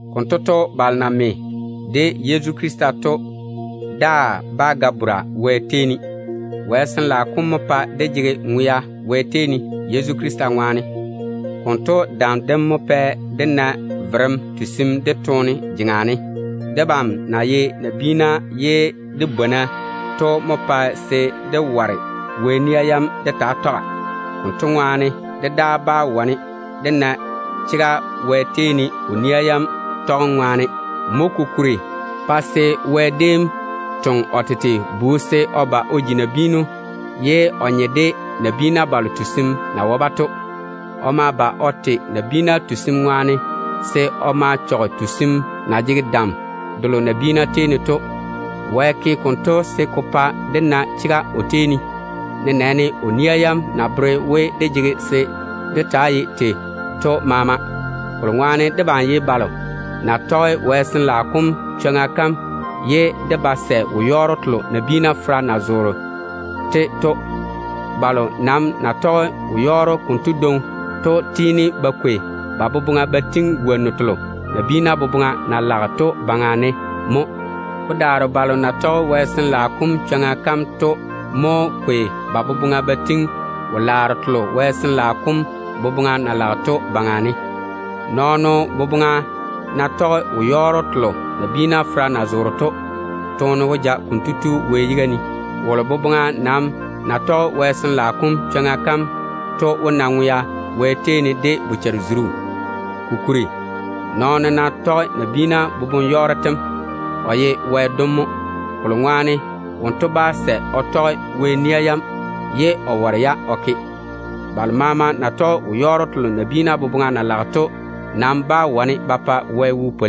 Konto to, balo na me de Yezu Krista to daa bá ga bora Wɛ tei ne. Wɛ Sin-laao kom mo pae dé jege ŋwea Wɛ tei ne Yezu Krista ŋwaane. Konto dam dem mo pɛ dé na verem tusim dedaane toone jeŋa ne. Debam na ye nabiina ye dé bwona to mo pae se dé ware Wɛ nia yam dé taa tɔga. Konto ŋwaane dé daa bá wane dé na chega Wɛ tei ne o nia yam tɔgem ŋwaane. Mo kokuri pa se Wɛ déem toŋe o tete Bu se o ba o ji nabiinu, ye o nye de nabiina balo tusim na wae-ba to. O ma ba o te nabiina wɛleera saarem ŋwaane, se o ma chɔge tusim na jege dam delo nabiina baŋa ne to. Wɛ ke konto se ko pa dé na chega o tei ne, nenɛɛne o nia yam na bere we dé jege se dé taa ye tei to maama. Kolo ŋwaane debam ye balo na tɔge Wɛ Sin-laao kom chwoŋa kam ye dé ba sɛ wo-yɔɔro telo nabiina fera na zoore to. Balo nam na tɔge wo-yɔɔro konto dwoŋi to tiini ba kwei ba boboŋa ba tiŋi wonnu telo nabiina boboŋa na lage to baŋa ne mo. Ko daare balo na tɔge Wɛ Sin-laao kom chwoŋa to mo kwei ba boboŋa ba tiŋi wo-laaro telo Sin-laao kom boboŋa na lage to baŋa ne. Nɔɔno boboŋa ná tɔge wo-yɔɔro telo nabiina fera na zoore to, toone wó ja konto tu Wɛ yiga ne. Wolo boboŋa nam na tɔge Wɛ Sin-laao kom chwoŋa to wó na ŋwea Wɛ tei ne de bochare-zuru. Kokuri, nɔɔno ná tɔge nabiina boboŋ-yɔɔro tem, kotu ye Wɛ dono mo, o na ba sɛ o tɔge Wɛ nia yam ye o ware-ya o ke to ŋwaane. Balo maama na tɔge wo-yɔɔro telo nabiina boboŋa na lage to nam bá wane ba pwoli Wɛ wo.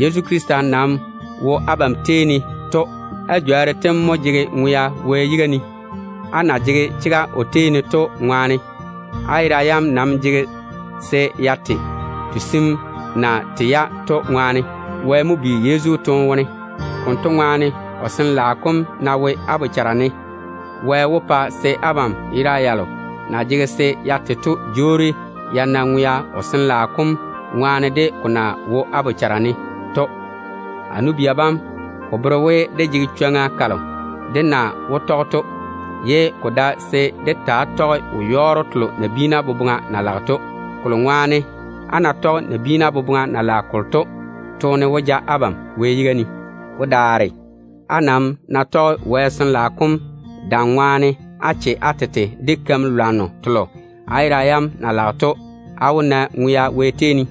Yezu Krista nam na wo abam tei ne to, á jworru tem mo jege ŋwea Wɛ yiga ne, á na jege chega o tei ne to ŋwaane. Á yera yam nam jege se ya te, tusim na tei-ya to ŋwaane. Wɛ mo bi Yezu toone wone. Konto ŋwaane, o Sin-laao kom ná wo á bochara ne, Wɛ wó pa se abam yera yalo na jege se ya te to jwoori ya na ŋwea, o Sin-laao kom na wo á bochara ne to ŋwaane. A nu-bia bam, ko bere we dé laam jege zele mo dé zeŋa. Ko nam dae se dé taa tɔge wo-yɔɔro telo nabiina boboŋa na lage to. Kolo ŋwaane, á ná tɔge nabiina boboŋa na lage kolo to, toone wó ja abam Wɛ yiga ne. Ko daare, á nam ná tɔge Sin-laao kom dam ŋwaane á che á tete de keim-lwanno telo á yera yam na lage to, á wó na ŋwea Wɛ tei ne.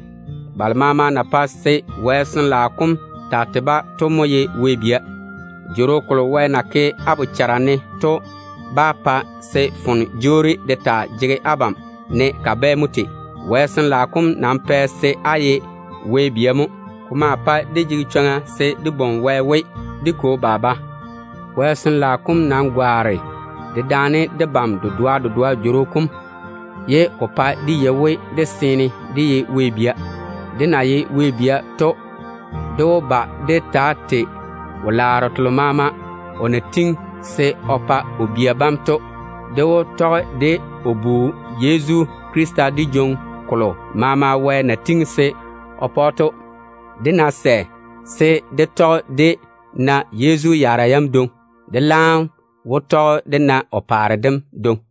Balo maama na pae se Wɛ Sin-laao kom taa tei-ba to mo ye Wɛ bia. Jworo kolo Wɛ na ke á bochara ne to ba pae se foone jwoori de taa jege abam ne kabɛ mo tei. Wɛ Sin-laao kom nam pae se á ye Wɛ bia mo. Ko maa pae dé jege chwoŋa se dé bwoŋi Wɛ we, “Dé Kwo, Baba.” Wɛ Sin-laao kom nam gwaane dedaane debam dedoa dedoa jworo kom, ye ko pae dé yei we dé seene dé ye Wɛ bia. Dé na ye Wɛ bia to, dé wó ba dé taa tei wo-laaro telo maama o na tiŋi se o pa o bia bam to. Dé wó tɔge de o Bu Yezu Krista dé jwoŋi kolo maama Wɛ na tiŋi se o pa‑o to. Dé ná sɛ se dé tɔge dé na Yezu yaara yam dwoŋi, dé laam wó tɔge dé na o paare dem dwoŋi.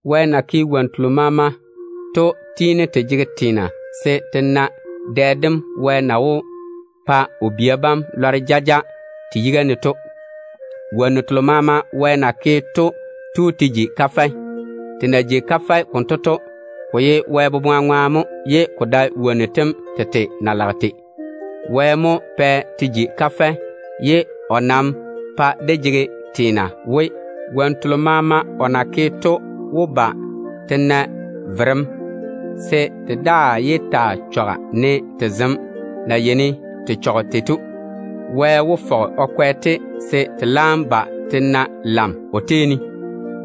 Wɛ na naane wonnu telo maama to tiini te jege teena se te na dɛ dem Wɛ na wó pa o bia bam lɔre jaja to. Wonnu telo Wɛ na naane to nam tu te ji wo-yɔɔro. Te na jigi wo-yɔɔro konto to, ko ye Wɛ boboŋa ŋwaane mo, ye ko dae wonnu tem tete na lage tei to. Wɛ mo pɛ te ji wo-yɔɔro ye o nam ta pa dé jege teena we, wonnu telo maama o na naane to wó ba te na verem, se te daa yé taa chɔga ne te zem na yeini te chɔge tei to. Wɛ wó fɔge o kwɛ-te se te laam ba te na nenɔŋa o tei ne,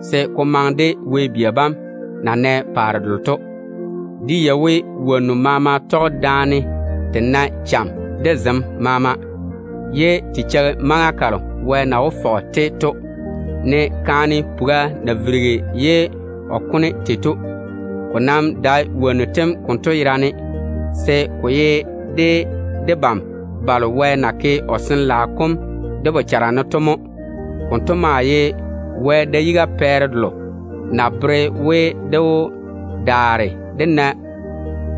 se ko maŋe de Wɛ bia bam tete na wó na paare delo to. Dé yei we wonnu maama tɔge daane te nae cham de zem maama. Te maa cheigi maŋa kalo Wɛ na wó fɔge-te to, ne kaane puga na virigi ye o kone tei to. Ko nam dae wonnu tem konto yerane, se ko ye debam balo Wɛ na ke o Sin-laao kom dé bochara ne to de mo. Konto maa ye Wɛ da-yiga pɛɛre delo na bere we, dé wó daare dé na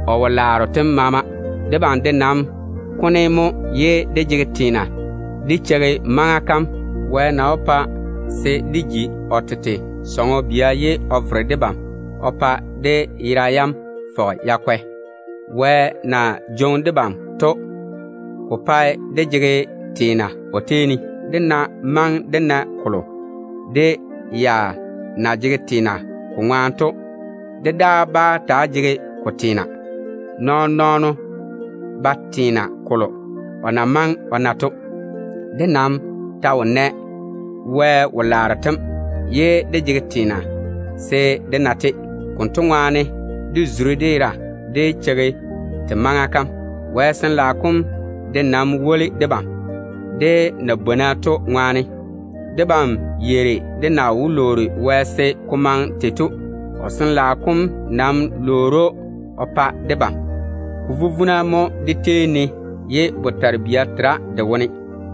o wo-laaro tem maama dé woli da. Debam de nam kone mo ye dé jege teena dé cheigi maŋa kam Wɛ na wó pa se dé ji o tete sɔŋɔ bia ye o vere debam o pa dé yera yam fɔge ya kwɛ. Wɛ na jwoŋi debam to, ko pae dé jege teena o tei ne. Dé nam ná maŋe dé na kolo dé ya na jege teena ko ŋwaane to, dé daa bá taa jege ko teena. Nɔɔn-nɔɔno ba teena kolo o na maŋe o na to. Dé nam ta wo nɛ Wɛ wo-laaro tem maama, ye dé jege teena se dé na-te. Konto ŋwaane, dé zuri dé yera dé cheigi se te maŋa kam laam yi. Wɛ Sin-laao kom de nam woli debam, dé na bwona to ŋwaane. Debam yeiri dé na wó lwoori Wɛ se ko maŋe tei to. O Sin-laao kom nam lwoori‑o o pa debam. Ko vuvuna mo dé tei ne ye botare-bia tera de wone.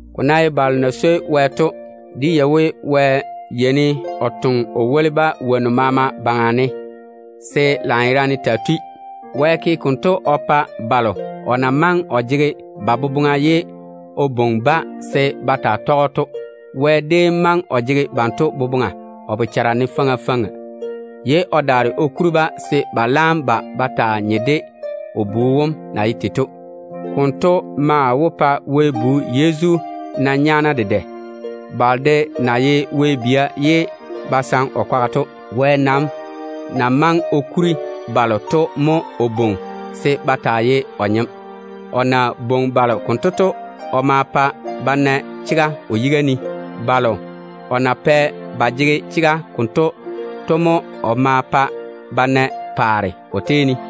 Ko ná ye balo na swoi Wɛ to, dé yei we Wɛ yeini o toŋe o woli-ba wonnu maama baŋa ne se lanyerane taa tui. Wɛ ke konto o pa balo o na maŋe o jege ba boboŋa ye o bwoŋi-ba se ba taa tɔge‑o to. Wɛ déem maŋe o jege banto boboŋa o bochare ne faŋa faŋa, ye o daare o kuri-ba se ba laam ba ba taa nye de o Bu wom na ye tei to. Konto maa wó pa Wɛ Bu Yezu na nyaana dedɛ, balo de na ye Wɛ bia ye ba saŋe o kwaga to. Wɛ nam na maŋe o kuri balo to mo o bwoŋi se ba taa ye o nyem. O na bwoŋi balo konto to, o ma pa ba na chega o yiga ne. Balo o na pɛ ba jege chega konto to mo o pɛ ba na paare o tei ne.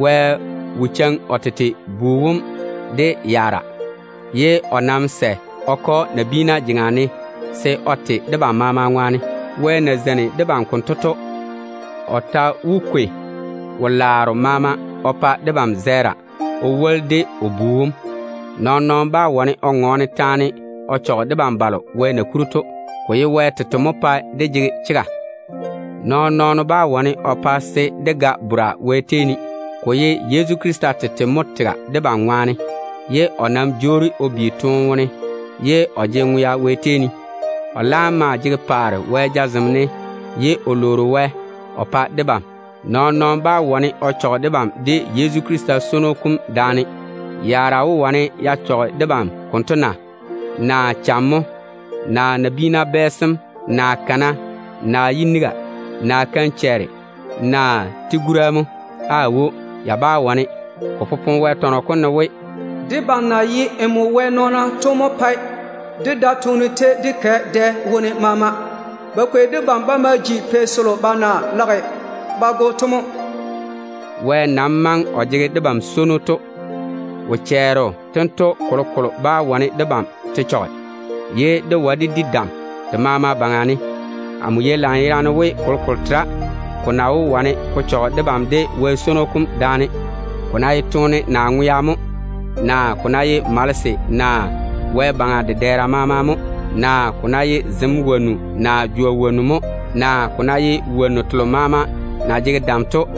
Wɛ wo cheiŋi o tete Bu wom de yaara, ye o nam sɛ o ke‑o nabiina jeŋa ne se o te debam maama ŋwaane. Wɛ na zeini debam konto to, o ta wó kwei wo-laaro maama o pa debam zɛɛra o woli de o Bu wom. Nɔɔn-nɔɔno bá wane o ŋɔɔne taane o chɔge debam balo Wɛ na kuri to. Ko ye Wɛ tete mo pae dé jege chega. Nɔɔn-nɔɔno bá wane o pa se dé ga bora Wɛ tei ne. Ko ye Yezu Krista tete mo tega debam ŋwaane, ye o ta jwoori o bi toone wone pa se o na ŋwea Wɛ tei ne. O laam maa jege paare Wɛ jazem seeni ye o lwoori Wɛ o pa debam. Nɔɔn-nɔɔno bá wane o chɔge debam de Yezu Krista swono kom daane. Yaara wó wane ya chɔge debam konto na? Naa cham mo, naa nabiina bɛɛsem, naa kana, naa yiniga, naa keim-chɛɛre, naa tigura mo? Aawo, ya bá wane. Ko popone Wɛ tɔnɔ kom ne we: “Debam na ye Wɛ nɔɔna to mo pae dé da toone tei dé kɛ dɛ maama wone. Ba kwei debam ba ma ji pei selo ba na lage ba go to mo.” Wɛ nam na maŋe o jege debam swono to, wo-chɛɛro tento kolokolo bá wane debam te chɔge, ye dé wae dé di dam te maama baŋa ne. Amo yei lanyerane we kolokolo tera ko na wó wane ko chɔge debam de Wɛ swono kom daane. Ko ná ye toone naa ŋwea mo, naa ko ná ye malese naa wɛ-baŋa dedɛɛra maama mo, naa ko ná ye zem wonnu naa jwa wonnu mo, naa ko ná ye wonnu telo maama na jege dam to,